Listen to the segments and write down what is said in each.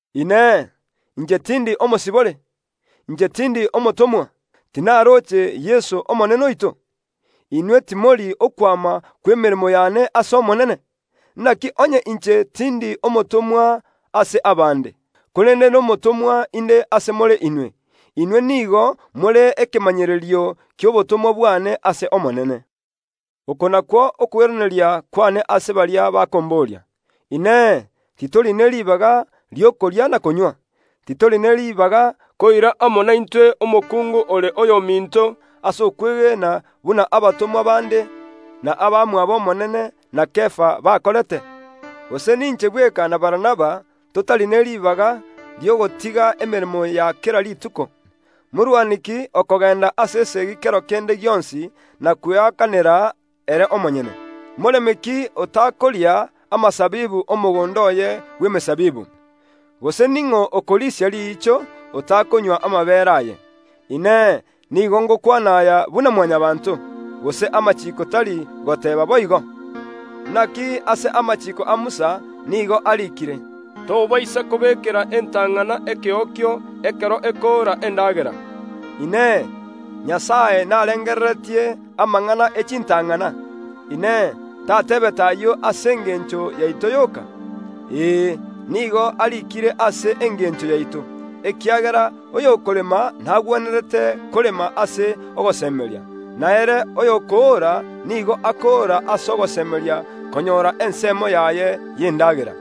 Inee! Inche tindi omosibore? Inche tindi omotomwa? Tinaroche Yeso, Omonene oito? Inwe timori okwama kw’emeremo yane ase Omonene? Naki onye inche tindi omotomwa ase abande, korende nomotomwa inde ase more inwe. Inwe nigo more ekemanyererio ki’obotomwa bwane ase Omonene. Oko nakwo okoiraneria kwane ase baria bakomboria. Inee! Titori ne ribaga ri’okoria na konywa? Titori ne ribaga koira amo naintwe omokungu ore oyominto ase okwegena buna abatomwa bande, na abamwabo Omonene, na Kefa bakorete? Gose ninche bweka na Barnaba totari ne ribaga ri’ogotiga emeremo ya kera rituko? Morwani ki okogenda ase esegi kero kende gionsi na kweakanera ere omonyene? Moremi ki otakoria amasabibu ’omogondo oye bw’emesabibu? Gose ning’o okorisia riicho, otakonywa amabeere aye? Inee! Nigo ngokwana aya buna Mwanyabaanto? Gose amachiiko tari goteeba boigo? Naki ase amachiiko a Musa nigo ariikire, “Tobaisa kobekera entang’ana ekeokio ekero ekoora endagera.” Inee! Nyasae narengereretie amang’ana e chintang’ana? Inee! Tateebete ayio ase engencho yaito yoka? Ee, nigo ariikire ase engencho yaito; ekiagera oyokorema nagwenerete korema ase ogosemeria, na ere oyokoora nigo akoora ase ogosemeria konyora ensemo yaye y’endagera.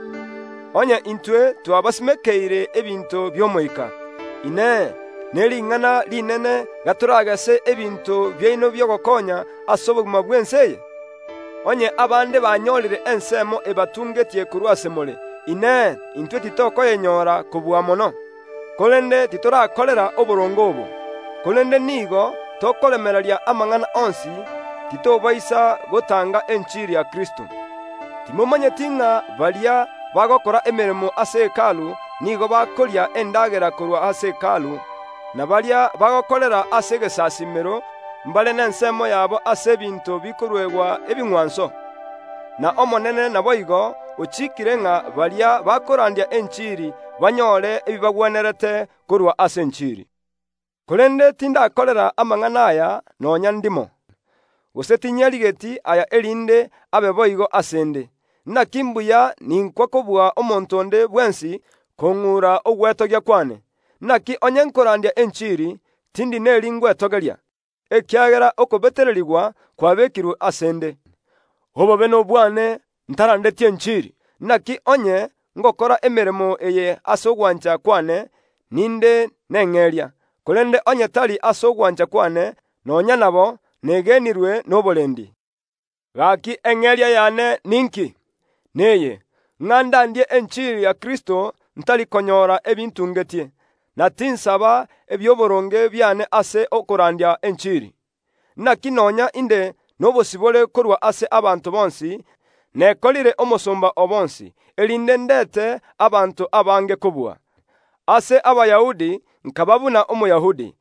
Onye intwe twabasimekeire ebinto bi’omoika, Inee, nering’ana rinene gatoragese ebinto biaino bi’ogokonya ase obogima bw’ense eye? Onye abande banyorire ensemo ebatungetie korwa ase more, Inee, intwe titokoyenyora kobua mono? Korende titorakorera oboronge obo; korende nigo tokoremereria amang’ana onsi, titobaisa gotanga enchiri ya Kristo. Timomanyeti ng’a baria bagokora emeremo ase Hekalu nigo bakoria endagera korwa ase Hekalu, na baria bagokorera ase egesasiimero mbare nensemo yabo ase ebinto bikoruegwa ebing’wanso? Na Omonene naboigo ochikiire ng’a baria bakorandia enchiri banyore ebibagwenerete korwa ase enchiri. Korende tindakorera amang’ana aya nonya ndimo. Gose tinyarigeti aya erinde abe boigo ase ’nde; naki mbuya ninkwa kobua omonto onde bwensi kong’ura ogwetogia kwane. Naki onye nkorandia enchiri, tindi neri ingwetogeria, ekiagera okobetererigwa kwabekirwe ase ’nde. Obobe nobwane ntarandeti enchiri! Naki onye ngokora emeremo eye ase ogwancha kwane, ninde neng’eria; korende onye tari ase ogwancha kwane, nonya nabo negenirwe noborendi. Gaki eng’eria yane ninki? Neye, ng’a ndandie enchiri ya Kristo ntari konyora ebintungetie, na tinsaba ebiaboronge biane ase okorandia enchiri. Naki nonya inde nobosibore korwa ase abanto bonsi, nekorire omosomba o bonsi, erinde ndete abanto abange kobua. Ase Abayahudi nkaba buna Omoyahudi,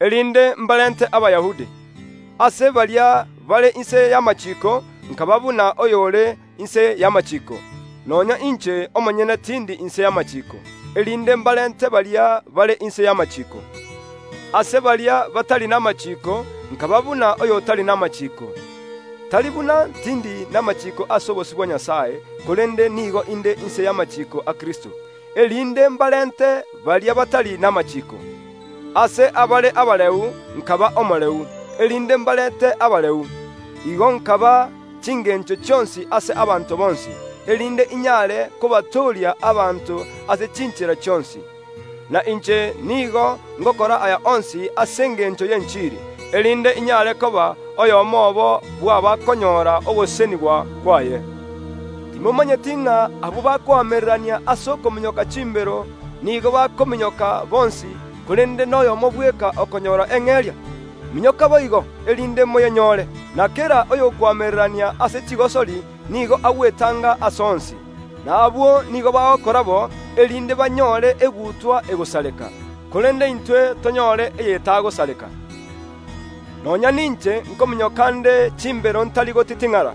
erinde mbarente Abayahudi; ase baria bare inse y’amachiiko nkaba buna oyore inse y’amachiiko (nonya inche omonyene tindi inse y’amachiiko) erinde mbarente baria bare inse y’amachiiko. Ase baria batari namachiiko nkaba buna oyo otari namachiiko (tari buna tindi namachiiko ase obosio bwa Nyasae, korende nigo inde inse y’amachiiko a Kristo) erinde mbarente baria batari namachiiko. Ase abare abareu nkaba omoreu, erinde mbarente abareu. Igo nkaba n’echingencho chionsi ase abanto bonsi, erinde inyare kobatooria abanto ase chinchera chionsi. Na inche nigo ngokora aya onsi ase engencho y’enchiri, erinde inyare koba oyomo obo bw’abakonyora ogosesenigwa kwaye. Timomanyeti ng’a abwo bakoamererania ase okominyoka chimbero, nigo bakominyoka bonsi, korende noyomo bweka okonyora eng’eria? Minyoka boigo, erinde moyenyore. Na kera oyokoamererania ase chigosori nigo agwetanga ase onsi. Na abwo nigo bagokora bo, erinde banyore egutwa egosareka, korende intwe tonyore eye etagosareka. Nonya ninche nkominyoka nde chimbero ntari gotiting’ara;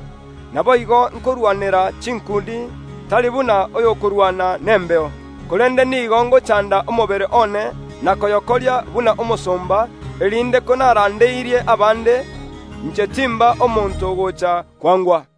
naboigo inkorwanera chinkundi, tari buna oyokorwana nembeo. Korende nigo ngochanda omobere one na koyokoria buna omosomba, erinde konarandeirie abande, inche timba omonto ogocha kwangwa.